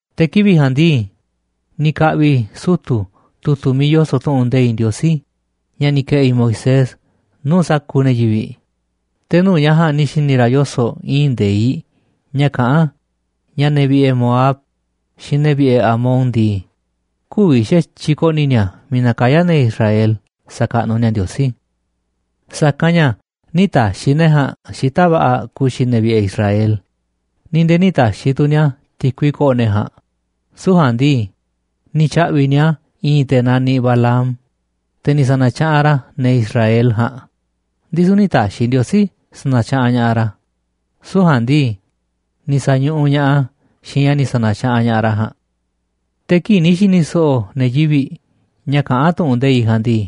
Te̱ kivi̱ꞌ ja̱a̱nꞌ ndii, ni̱ ka̱ꞌvi̱ sutu̱ tu̱tu̱ miiꞌ yoso̱ꞌ tu̱ꞌu̱n nde̱iꞌ Ndiosí ña̱ ni̱ ke̱ꞌi̱ Moisés nuu̱ꞌ sa̱kuuꞌ ne̱ yivi̱ꞌ, te̱ nuu̱ꞌ ña̱ ja̱a̱nꞌ ni̱ xi̱ni̱ ra̱ yoso̱ꞌ i̱i̱n nde̱iꞌ ña̱ kaꞌán ña̱ ne̱ vi̱ꞌe̱ Moab xiinꞌ ne̱ vi̱ꞌe̱ Amon ndii, kü̱vi̱ xa̱tyiꞌ ko̱ꞌni̱ ni̱a̱ miiꞌ nakayá ne̱ Israel xakaꞌnuꞌ ni̱a̱ Ndiosí, sa̱kanꞌ ña̱ nï̱ ta̱xi̱ ne̱ ja̱a̱nꞌ xita̱ꞌ va̱ꞌa̱ ku̱xi̱ ne̱ vi̱ꞌe̱ Israel, ni̱ nde̱e̱ nï̱ ta̱xi̱ tu̱ ni̱a̱ ti̱kui ko̱ꞌo̱ ne̱ ja̱a̱nꞌ, süu̱ꞌ ja̱a̱nꞌ ndii, ni̱ tya̱ꞌvi̱ꞌ ni̱a̱ i̱i̱n te̱ naniꞌ Balaam, te̱ ni̱ sa̱na̱tyaꞌanꞌ ra̱ ne̱ Israel ja̱a̱nꞌ, ndisu̱ nï̱ ta̱xi̱ Ndiosí sa̱na̱tyaꞌanꞌ ña̱ꞌaꞌ ra̱, süu̱ꞌ ja̱a̱nꞌ ndii, ni̱ sa̱ñuꞌuꞌ ña̱ꞌaꞌ a̱ xiinꞌ ña̱ ni̱ sa̱na̱tyaꞌanꞌ ña̱ꞌaꞌ ra̱ ja̱a̱nꞌ. Te̱ kii̱ꞌ ni̱ xi̱ni̱ so̱ꞌo̱ ne̱ yivi̱ꞌ ña̱ kaꞌán tu̱ꞌu̱n nde̱iꞌ ja̱a̱nꞌ ndii,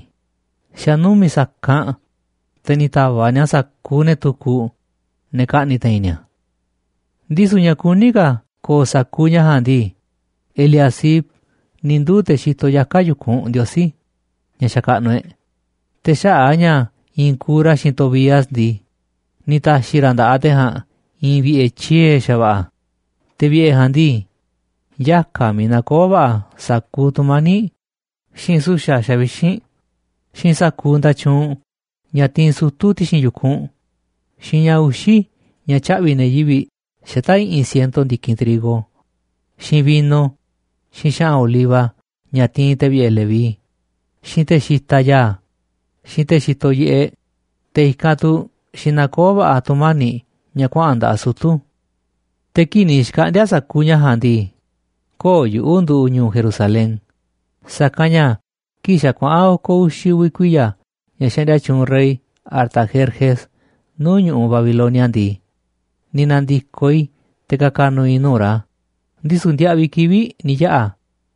xa̱ numi̱ꞌ sa̱kanꞌ, te̱ ni̱ ta̱va̱ꞌ ni̱a̱ sa̱kuuꞌ ne̱ tukuꞌ, ne̱ kaꞌni̱ te̱i̱n ni̱a̱. Ndisu̱ ña̱ kuní ka̱ ko̱o̱ sa̱kuuꞌ ña̱ ja̱a̱nꞌ ndii, Eliasib ni̱ nduu̱ te̱ xitoꞌ yaka̱ yu̱kunꞌ Ndiosí, ña̱ xakaꞌnuꞌ e̱ꞌ, te̱ xaꞌa̱ꞌ a̱ ña̱ iinꞌ kuuꞌ ra̱ xiinꞌ Tobías ndii, ni̱ ta̱xi̱ ra̱ nda̱ꞌaꞌ te̱ ja̱a̱nꞌ i̱i̱n vi̱ꞌe̱ tyiee̱ xa̱va̱ꞌa̱, te̱ vi̱ꞌe̱ ja̱a̱nꞌ ndii, yaka̱ miiꞌ nakoó va̱ꞌa̱ sa̱kuuꞌ tu̱mani̱ꞌ, xiinꞌ su̱xa̱ xavixínꞌ, xiinꞌ sa̱kuuꞌ nda̱tyuunꞌ, ña̱ tiinꞌ sutu̱ ti̱xi̱n yu̱kunꞌ, xiinꞌ ña̱ uxi̱ ña̱ tyaꞌvi̱ꞌ ne̱ yivi̱ꞌ xata̱ꞌ i̱ꞌi̱n siento ndi̱kinꞌ trigo, xiinꞌ vino, xiinꞌ xa̱ꞌa̱n oliva ña̱ tiinꞌ te̱ vi̱ꞌe̱ Leví, xiinꞌ te̱ xitaꞌ ya̱a̱, xiinꞌ te̱ xitoꞌ yiꞌeꞌ, te̱ i̱kanꞌ tu̱ xi nakoó va̱ꞌa̱ tu̱mani̱ꞌ ña̱ kuaꞌa̱n nda̱ꞌaꞌ sutu̱. Te̱ kii̱ꞌ ni̱ xkaꞌndi̱a̱ sa̱kuuꞌ ña̱ ja̱a̱nꞌ ndii, köo̱ꞌ yuꞌu̱ nduꞌu̱ꞌ ñu̱u̱ Jerusalén, sa̱kanꞌ ña̱ kii̱ꞌ xa̱ kuaꞌa̱n oko̱ uxi̱ uvi̱ kuiya̱ ña̱ xaꞌndia tyuunꞌ rey Artajerjes nuu̱ꞌ ñu̱ꞌuꞌ Babilonia ndii, ni̱ na̱ndi̱koꞌ i̱ te̱ ka̱ka̱ nu̱u̱ i̱ nuu̱ꞌ ra̱, ndisu̱ ndiaꞌviꞌ kivi̱ꞌ ni̱ yaꞌa̱,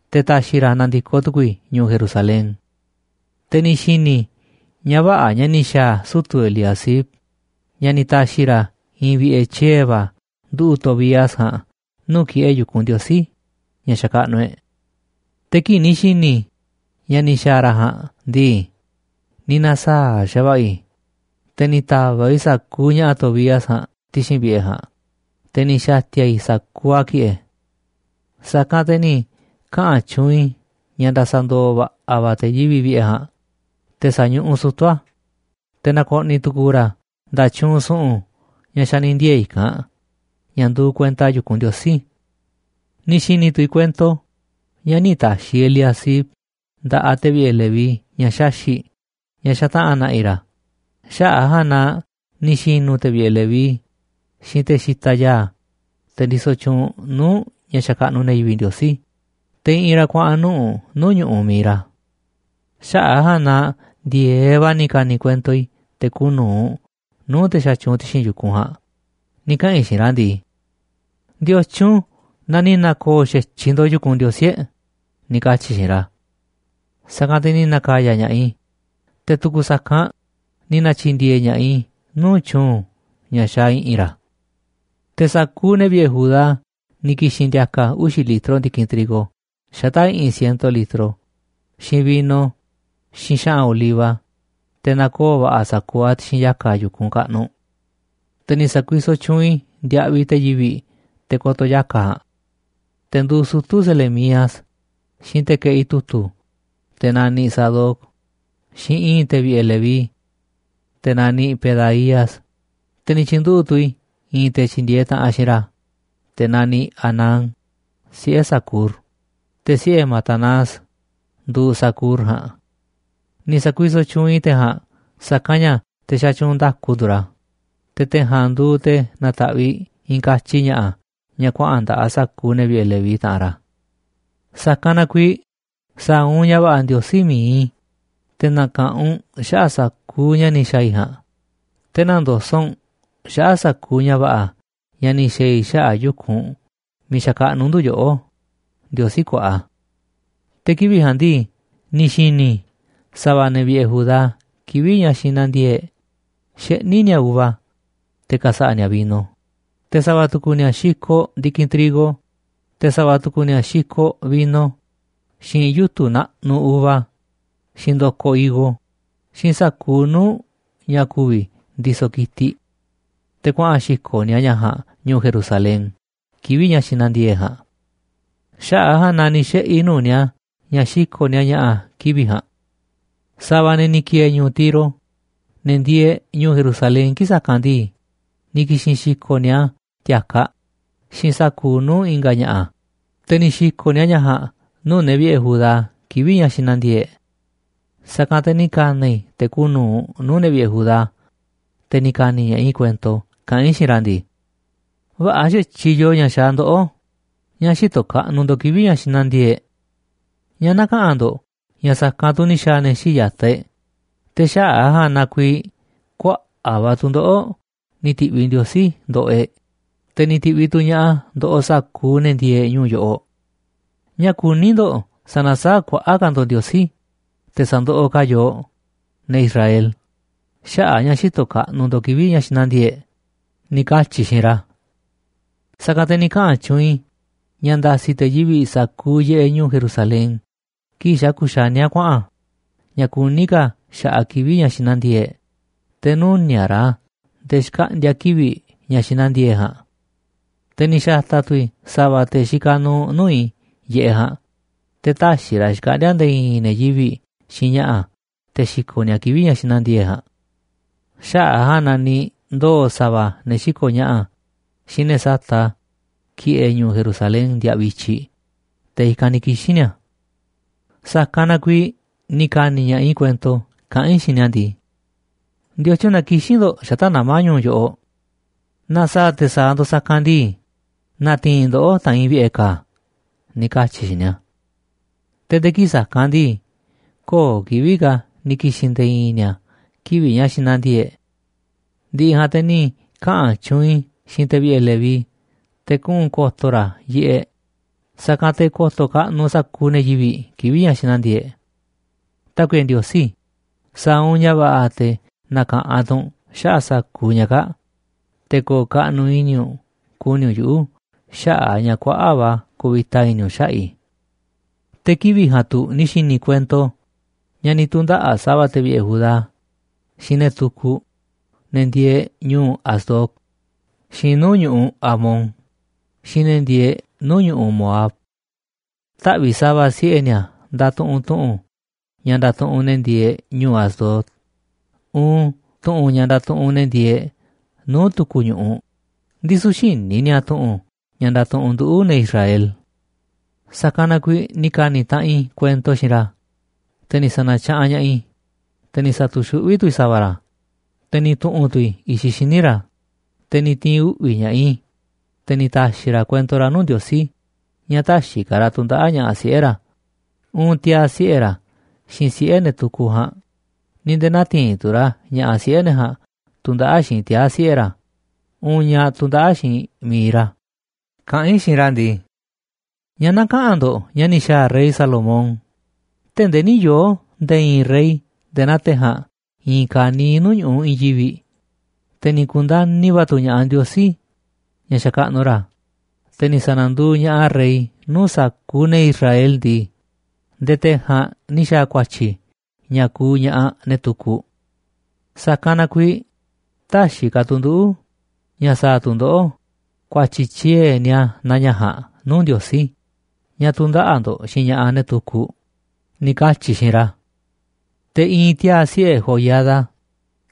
te̱ ta̱xi̱ ra̱ na̱ndi̱koꞌ tu̱ku̱u̱ i̱ ñu̱u̱ Jerusalén. Te̱ ni̱ xi̱ni̱ i̱ ña̱ vä̱ꞌa̱ ña̱ ni̱ xa̱a̱ sutu̱ Eliasib ña̱ ni̱ ta̱xi̱ ra̱ i̱i̱n vi̱ꞌe̱ tyiee̱ va̱ nduꞌu̱ꞌ Tobías ja̱a̱nꞌ nuu̱ꞌ ki̱ꞌe̱ yu̱kunꞌ Ndiosí, ña̱ xakaꞌnuꞌ e̱ꞌ. Te̱ kii̱ꞌ ni̱ xi̱ni̱ i̱ ña̱ ni̱ xa̱a̱ ra̱ ja̱a̱nꞌ ndii, ni̱ na̱saa̱ꞌ xa̱va̱ꞌa̱ i̱, te̱ ni̱ ta̱va̱ꞌ i̱ sa̱kuuꞌ ña̱ꞌa̱ Tobías ja̱a̱nꞌ ti̱xi̱n vi̱ꞌe̱ ja̱a̱nꞌ, te̱ ni̱ xa̱ti̱a̱ i̱ sa̱kuuꞌ a̱ ki̱ꞌe̱. Sa̱kanꞌ te̱ ni̱ kaꞌa̱n tyuunꞌ i̱ ña̱ nda̱sa̱ndo̱o̱ va̱ꞌa̱ va̱ te̱ yivi̱ꞌ vi̱ꞌe̱ ja̱a̱nꞌ, te̱ sa̱ñuꞌuꞌ sutu̱ a̱, te̱ na̱ko̱ꞌni̱ tu̱ku̱u̱ ra̱ nda̱tyuunꞌ su̱ꞌu̱n ña̱ xa̱ ni̱ ndiee̱ i̱kanꞌ, ña̱ nduuꞌ kuenta yu̱kunꞌ Ndiosí. Ni̱ xi̱ni̱ tu̱ i̱ kuento ña̱ nï̱ ta̱xi̱ Eliasib nda̱ꞌaꞌ te̱ vi̱ꞌe̱ Leví ña̱ xaxi̱ꞌ ña̱ xataꞌa̱n na̱ꞌi̱ ra̱, xaꞌa̱ꞌ a̱ ja̱a̱nꞌ na ni̱ xi̱nu̱ te̱ vi̱ꞌe̱ Leví xiinꞌ te̱ xitaꞌ ya̱a̱, te̱ ndisoꞌ tyuunꞌ nuu̱ꞌ ña̱ xakaꞌnuꞌ ne̱ yivi̱ꞌ Ndiosí, te̱ i̱ꞌi̱n ra̱ kuaꞌa̱n nuꞌu̱ꞌ nuu̱ꞌ ñu̱ꞌuꞌ mi̱iꞌ ra̱. Xaꞌa̱ꞌ a̱ ja̱a̱nꞌ na ndi̱e̱eꞌ va̱ ni̱ ka̱ni̱ kuento i̱ te̱ kuuꞌ nu̱uꞌ nuu̱ꞌ te̱ xatyuunꞌ ti̱xi̱n yu̱kunꞌ ja̱a̱nꞌ ni̱ kaꞌa̱n i̱ xiinꞌ ra̱ ndii: ―¿Ndiotyun na ni̱ na̱ko̱o̱ xa̱tyiꞌ ndo̱ꞌ yu̱kunꞌ Ndiosí e̱ꞌ? ―ni̱ katyi̱ i̱ xiinꞌ ra̱. Sa̱kanꞌ te̱ ni̱ na̱ka̱ya̱ ña̱ꞌaꞌ i̱, te̱ tu̱ku̱ sa̱kanꞌ ni̱ na̱tyi̱ndi̱e̱e̱ ña̱ꞌaꞌ i̱ nuu̱ꞌ tyu̱u̱n ña̱ xaaꞌ i̱ꞌi̱n ra̱. Te̱ sa̱kuuꞌ ne̱ vi̱ꞌe̱ Judá ni̱ ki̱xi̱n ndi̱a̱ka̱ uxi̱ litro ndi̱kinꞌ trigo xata̱ꞌ i̱ꞌi̱n siento litro, xiinꞌ vino, xiinꞌ xa̱ꞌa̱n oliva te̱ na̱koo̱ va̱ꞌa̱ a̱ sa̱kuuꞌ a̱ ti̱xi̱n yaka̱ yu̱kunꞌ kaꞌnuꞌ. Te̱ ni̱ sa̱kuisoꞌ tyuunꞌ i̱ ndiaꞌviꞌ te̱ yivi̱ꞌ te̱ ko̱to̱ yaka̱ ja̱a̱nꞌ. Te̱ nduuꞌ sutu̱ Selemías, xiinꞌ te̱ keꞌi tu̱tu̱, te̱ naniꞌ Sadoc, xiinꞌ i̱i̱n te̱ vi̱ꞌe̱ Leví, te̱ naniꞌ Pedaías, te̱ ni̱ tyi̱nduꞌu̱ꞌ tu̱ i̱ i̱i̱n te̱ tyi̱ndi̱e̱eꞌ taꞌanꞌ xiinꞌ ra̱, te̱ naniꞌ Hanán, siꞌe̱ Zacur, te̱ siꞌe̱ Matanías nduuꞌ Zacur ja̱a̱nꞌ. Ni̱ sa̱kuisoꞌ tyuunꞌ i̱ te̱ ja̱a̱nꞌ sa̱kanꞌ ña̱ te̱ xatyuunꞌ nda̱ku nduuꞌ ra̱, te̱ te̱ ja̱a̱nꞌ nduuꞌ te̱ nataꞌviꞌ i̱i̱n katyi ña̱ꞌa̱ ña̱ kuaꞌa̱n nda̱ꞌaꞌ sa̱kuuꞌ ne̱ vi̱ꞌe̱ Leví, taꞌanꞌ ra̱. ¡Sa̱kanꞌ na kuiiꞌ sa̱a̱ u̱nꞌ ña̱ va̱ꞌa̱, Ndiosí mi̱iꞌ i̱, te̱ na̱ka̱ꞌanꞌ u̱nꞌ xaꞌa̱ꞌ sa̱kuuꞌ ña̱ ni̱ xa̱a̱ i̱ ja̱a̱nꞌ, te̱ nä̱ndoso̱ꞌ u̱nꞌ xaꞌa̱ꞌ sa̱kuuꞌ ña̱ va̱ꞌa̱ ña̱ ni̱ xa̱a̱ i̱ xaꞌa̱ꞌ yu̱kunꞌ miiꞌ xakaꞌnuꞌ ndu̱ yoꞌó, Ndiosí kuaꞌa! Te̱ kivi̱ꞌ ja̱a̱nꞌ ndii, ni̱ xi̱ni̱ i̱ sa̱va̱ ne̱ vi̱ꞌe̱ Judá kivi̱ꞌ ña̱ xi nandiee̱ꞌ e̱ꞌ xeꞌní ni̱a̱ uva te̱ ka̱sa̱ꞌa̱ ni̱a̱ vino, te̱ sa̱va̱ tu̱ku̱ ni̱a̱ xikoꞌ ndi̱kinꞌ trigo, te̱ sa̱va̱ tu̱ku̱ ni̱a̱ xikoꞌ vino, xiinꞌ yutu̱ naꞌnuꞌ uva, xiinꞌ ndo̱koꞌ higo, xiinꞌ sa̱kuuꞌ nuu̱ꞌ ña̱ ku̱vi̱ ndisoꞌ ki̱tiꞌ. Te̱ kuaꞌa̱n xi̱ko̱ꞌ ni̱a̱ ña̱ ja̱a̱nꞌ ñu̱u̱ Jerusalén kivi̱ꞌ ña̱ xinandiee̱ꞌ e̱ꞌ ja̱a̱nꞌ. Xaꞌa̱ꞌ a̱ ja̱a̱nꞌ na ni̱ xiꞌe̱ i̱ nuu̱ꞌ ni̱a̱ ña̱ xiko̱ꞌ ni̱a̱ ña̱ꞌa̱ kivi̱ꞌ ja̱a̱nꞌ. Sa̱va̱ ne̱ ni̱ ki̱e̱e̱ ñu̱u̱ Tiro, ne̱ ndieeꞌ ñu̱u̱ Jerusalén kii̱ꞌ sa̱kanꞌ ndii, ni̱ ki̱xi̱n xi̱ko̱ꞌ ni̱a̱ ti̱a̱kaꞌ xiinꞌ sa̱kuuꞌ nuu̱ꞌ i̱nga̱ ña̱ꞌa̱, te̱ ni̱ xi̱ko̱ꞌ ni̱a̱ ña̱ ja̱a̱nꞌ nuu̱ꞌ ne̱ viꞌe Judá kivi̱ꞌ ña̱ xinandiee̱ꞌ e̱ꞌ. Sa̱kanꞌ te̱ ni̱ ka̱na̱ i̱ te̱ kuuꞌ nu̱uꞌ nuu̱ꞌ ne̱ vi̱ꞌe̱ Judá, te̱ ni̱ ka̱ni̱ ña̱ꞌaꞌ i̱ kuento kaꞌán i̱ xiinꞌ ra̱ ndii: ―Vä̱ꞌa̱ xa̱tyiꞌ yoo ña̱ xaaꞌ ndoꞌó ña̱ xïtoꞌ kaꞌnuꞌ ndo̱ꞌ kivi̱ꞌ ña̱ xinandiee̱ꞌ e̱ꞌ. ¿Ñáá näkaꞌanꞌ ndo̱ꞌ ña̱ sa̱kanꞌ tu̱ ni̱ xa̱a̱ ne̱ xíiꞌ ya̱taꞌ e̱ꞌ, te̱ xaꞌa̱ꞌ a̱ ja̱a̱nꞌ na kuiiꞌ kuaꞌa̱ꞌ va̱ tu̱ndoꞌo̱ꞌ ni̱ ti̱ꞌviꞌ Ndiosí ndoꞌoꞌ e̱ꞌ, te̱ ni̱ ti̱ꞌviꞌ tu̱ ña̱ꞌaꞌ a̱ ndoꞌoꞌ sa̱kuuꞌ ne̱ ndieeꞌ ñu̱u̱ yoꞌoꞌ? ¿Ñáá kuní ndo̱ꞌ sa̱na̱saáꞌ kuaꞌa̱ꞌ ka̱ ndo̱ꞌ Ndiosí, te̱ sa̱ndoꞌoꞌ ka̱ a̱ yooꞌ, ne̱ Israel, xaꞌa̱ꞌ a̱ ña̱ xïtoꞌ kaꞌnuꞌ ndo̱ꞌ kivi̱ꞌ ña̱ xinandiee̱ꞌ e̱ꞌ? ―ni̱ katyi̱ i̱ xiinꞌ ra̱. Sa̱kanꞌ te̱ ni̱ kaꞌa̱n tyuunꞌ i̱ ña̱ nda̱si̱ te̱ yivi̱ꞌ sa̱kuuꞌ yiꞌeꞌ ñu̱u̱ Jerusalén kii̱ꞌ xa̱ kuxaníá kuaꞌa̱n ña̱ kuní ka̱ xa̱ꞌaꞌ kivi̱ꞌ ña̱ xinandiee̱ꞌ e̱ꞌ, te̱ nü̱niaꞌ ra̱ a̱ nde̱e̱ xkaꞌndi̱a̱ kivi̱ꞌ ña̱ xinandiee̱ꞌ e̱ꞌ ja̱a̱nꞌ. Te̱ ni̱ xa̱ta̱ tu̱ i̱ sa̱va̱ te̱ xikaꞌ nuuꞌ nuu̱ꞌ i̱ yiꞌeꞌ ja̱a̱nꞌ te̱ tä̱xi̱ ra̱ xkaꞌndi̱a̱ nde̱e̱ i̱i̱n ne̱ yivi̱ꞌ xiinꞌ ña̱ꞌa̱ te̱ xi̱ko̱ꞌ ni̱a̱ a̱ kivi̱ꞌ ña̱ xinandiee̱ꞌ e̱ꞌ ja̱a̱nꞌ. Xaꞌa̱ꞌ a̱ ja̱a̱nꞌ na ni̱ ndoo̱ sa̱va̱ ne̱ xiko̱ꞌ ña̱ꞌa̱ xiinꞌ ne̱ sata̱ꞌ a̱ ki̱ꞌe̱ ñu̱u̱ Jerusalén ndiaꞌviꞌ i̱tyiꞌ, te̱ i̱kanꞌ ni̱ kixi̱n ni̱a̱. Sa̱kanꞌ na kuiiꞌ ni̱ ka̱ni̱ ña̱ꞌaꞌ i̱ kuento kaꞌán i̱ xiinꞌ ni̱a̱ ndii: ―¿Ndiotyun na kixín ndo̱ꞌ xata̱ꞌ nama̱ ñu̱u̱ yoꞌoꞌ? Naaꞌ sa̱a̱ te̱ sa̱a̱ ndo̱ꞌ sa̱kanꞌ ndii, na̱ti̱i̱n i̱ ndoꞌó ta̱a̱nꞌ i̱ vi̱ꞌe̱ ka̱a̱ ―ni̱ katyi̱ i̱ xiinꞌ ni̱a̱. Te̱ nde̱e̱ kii̱ꞌ sa̱kanꞌ ndii, köo̱ꞌ kivi̱ꞌ ka̱ ni̱ ki̱xi̱n nde̱e̱ i̱i̱n ni̱a̱ kivi̱ꞌ ña̱ xinandiee̱ꞌ e̱ꞌ. Ndi̱ꞌi̱ ja̱a̱nꞌ te̱ ni̱ kaꞌa̱n tyuunꞌ i̱ xiinꞌ te̱ vi̱ꞌe̱ Leví te̱ kuꞌu̱n ko̱to̱ ra̱ yiꞌeꞌ, sa̱kanꞌ te̱ ko̱to̱ kaꞌnuꞌ sa̱kuuꞌ ne̱ yivi̱ꞌ kivi̱ꞌ ña̱ xinandiee̱ꞌ e̱ꞌ. Tákuiꞌe Ndiosí, sa̱a̱ u̱nꞌ ña̱ va̱ꞌa̱ te̱ na̱ka̱ꞌanꞌ tu̱ u̱nꞌ xaꞌa̱ꞌ sa̱kuuꞌ ña̱ kaa̱ꞌ, te̱ ko̱o̱ kaꞌnuꞌ i̱ni̱ u̱nꞌ ku̱ni̱ u̱nꞌ yuꞌu̱ xaꞌa̱ꞌ a̱ ña̱ kuaꞌa̱ꞌ va̱ kuvita i̱ni̱ u̱nꞌ xaꞌa̱ꞌ i̱. Te̱ kivi̱ꞌ ja̱a̱nꞌ tu̱ ni̱ xi̱ni̱ i̱ kuento ña̱ ni̱ tu̱ndaꞌa̱ꞌ sa̱va̱ te̱ vi̱ꞌe̱ Judá xiinꞌ ne̱ tukuꞌ, ne̱ ndieeꞌ ñuu Asdod, xiinꞌ nuu̱ꞌ ñu̱ꞌuꞌ Amón xiinꞌ ne̱ ndieeꞌ nuu̱ꞌ ñu̱ꞌuꞌ Moab. Taꞌvi̱ꞌ sa̱va̱ siꞌe̱ ni̱a̱ ndatuꞌunꞌ tu̱ꞌu̱n ña̱ ndatuꞌunꞌ ne̱ ndieeꞌ ñuu Asdod, uun tu̱ꞌu̱n ña̱ ndatuꞌunꞌ ne̱ ndieeꞌ nuu̱ꞌ tu̱ku̱ ñu̱ꞌuꞌ, ndisu̱ xïní ni̱a̱ tu̱ꞌu̱n ña̱ ndatuꞌunꞌ nduꞌu̱, ne̱ Israel. Sa̱kanꞌ na kuiiꞌ ni̱ ka̱ni̱ taꞌanꞌ i̱ kuento xiinꞌ ra̱, te̱ ni̱ sa̱na̱tyaꞌanꞌ ña̱ꞌaꞌ i̱, te̱ ni̱ sa̱tu̱xuꞌví tu̱ i̱ sa̱va̱ ra̱, te̱ ni̱ tu̱ꞌu̱n tu̱ i̱ i̱xiꞌ xíniꞌ ra̱, te̱ ni̱ ti̱i̱n uꞌvi̱ ña̱ꞌaꞌ i̱, te̱ ni̱ ta̱xi̱ ra̱ kuento ra̱ nuu̱ꞌ Ndiosí ña̱ tä̱xi̱ ka̱ ra̱ tu̱ndaꞌa̱ꞌ ña̱ꞌaꞌ siꞌe̱ ra̱, uun tiaa̱ siꞌe̱ ra̱ xiinꞌ siꞌe̱ ne̱ tukuꞌ ja̱a̱nꞌ, ni̱ nde̱e̱ nä̱ti̱i̱n tu̱ ra̱ ña̱ꞌaꞌ siꞌe̱ ne̱ ja̱a̱nꞌ tu̱ndaꞌa̱ꞌ xiinꞌ tiaa̱ siꞌe̱ ra̱, uun ñaꞌ tu̱ndaꞌa̱ꞌ xiinꞌ mi̱iꞌ ra̱, kaꞌán i̱ xiinꞌ ra̱ ndii: ―¿Ñáá näkaꞌanꞌ ndo̱ꞌ ña̱ ni̱ xa̱a̱ rey Salomón? Tee̱ꞌ ndee nï̱ yoo̱ nde̱e̱ i̱i̱n rey nde̱e̱ naa te̱ ja̱a̱nꞌ i̱i̱n kaniiꞌ nuu̱ꞌ ñu̱ꞌuꞌ i̱i̱n yivi̱ꞌ, te̱ ni̱ ku̱ndani̱ va̱ tu̱ ña̱ꞌaꞌ Ndiosí, ña̱ xakaꞌnuꞌ ra̱, te̱ ni̱ sa̱na̱nduuꞌ ña̱ꞌaꞌ a̱ rey nuu̱ꞌ sa̱kuuꞌ ne̱ Israel ndii, nde̱e̱ te̱ ja̱a̱nꞌ ni̱ xa̱a̱ ku̱a̱tyi̱ ña̱ kuuꞌ ña̱ꞌaꞌ ne̱ tukuꞌ. Sa̱kanꞌ na kuiiꞌ tä̱xi̱ ka̱ tu̱ nduꞌu̱ ña̱ sa̱a̱ tu̱ ndoꞌó ku̱a̱tyi̱ tyiee̱ nia naa ña̱ ja̱a̱nꞌ nuu̱ꞌ Ndiosí, ña̱ tu̱ndaꞌa̱ꞌ ndo̱ꞌ xiinꞌ ña̱ꞌaꞌ, ne̱ tukuꞌ ―ni̱ katyi̱ i̱ xiinꞌ ra̱. Te̱ i̱i̱n tiaa̱ siꞌe̱ Joiada,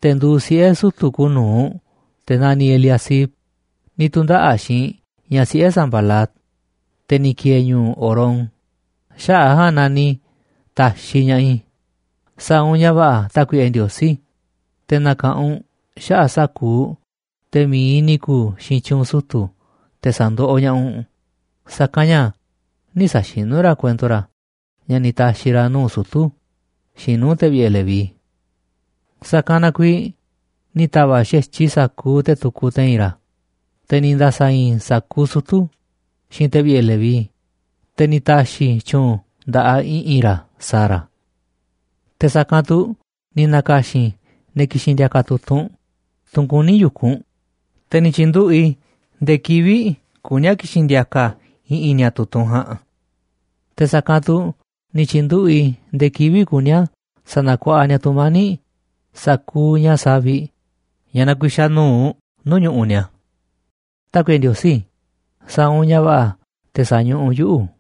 te̱ nduuꞌ siꞌe̱ sutu̱ kuuꞌ nu̱uꞌ te̱ naniꞌ Eliasib, ni̱ tu̱ndaꞌa̱ꞌ xiinꞌ ñaꞌ siꞌe̱ Sambalat, te̱ ni̱ ki̱e̱e̱ ñu̱u̱ Horón, xaꞌa̱ꞌ a̱ ja̱a̱nꞌ na ni̱ ta̱xiꞌ ña̱ꞌaꞌ i̱. Sa̱a̱ u̱nꞌ ña̱ va̱ꞌa̱, Tákuiꞌe Ndiosí, te̱ na̱ka̱ꞌanꞌ u̱nꞌ xaꞌa̱ꞌ sa̱kuuꞌ te̱ mi̱iꞌ ni̱ ku̱u̱ xiinꞌ tyu̱u̱n sutu̱ te̱ sa̱ndoꞌoꞌ ña̱ꞌaꞌ u̱nꞌ, sa̱kanꞌ ña̱ nï̱ sa̱xinú ra̱ kuento ra̱ ña̱ ni̱ ta̱xi̱ ra̱ nuu̱ꞌ sutu̱ xiinꞌ nuu̱ꞌ te̱ vi̱ꞌe̱ Leví. Sa̱kanꞌ na kuiiꞌ ni̱ ta̱va̱ꞌ xa̱tyiꞌ i̱ sa̱kuuꞌ te̱ tukuꞌ te̱i̱n ra̱, te̱ ni̱ nda̱sa̱i̱i̱n i̱ sa̱kuuꞌ sutu̱, xiinꞌ te̱ vi̱ꞌe̱ Leví, te̱ ni̱ ta̱xi̱ i̱ tyu̱u̱n nda̱ꞌaꞌ i̱ꞌi̱n ra̱ sa̱a̱ ra̱. Te̱ sa̱kanꞌ tu̱ ni̱ na̱ka̱xi̱n i̱ ne̱ ki̱xi̱n ndi̱a̱ka̱ tu̱tunꞌ, tunꞌ kuní yu̱kunꞌ, te̱ ni̱ tyi̱nduꞌu̱ꞌ i̱ ndee kivi̱ꞌ kuní a̱ ki̱xi̱n ndi̱a̱ka̱ i̱ꞌi̱n ni̱a̱ tu̱tunꞌ ja̱a̱nꞌ. Te̱ sa̱kanꞌ tu̱ ni̱ tyi̱nduꞌu̱ꞌ i̱ ndee kivi̱ꞌ kuní a̱ sa̱na̱kuaꞌa ni̱a̱ tu̱mani̱ꞌ sa̱kuuꞌ ña̱ saviꞌ ña̱ nakuixaꞌ nu̱uꞌ nuu̱ꞌ ñu̱ꞌuꞌ ni̱a̱. Tákuiꞌe Ndiosí sa̱a̱ u̱nꞌ ña̱ va̱ꞌa̱ te̱ sa̱ñuꞌuꞌ u̱nꞌ yuꞌu̱.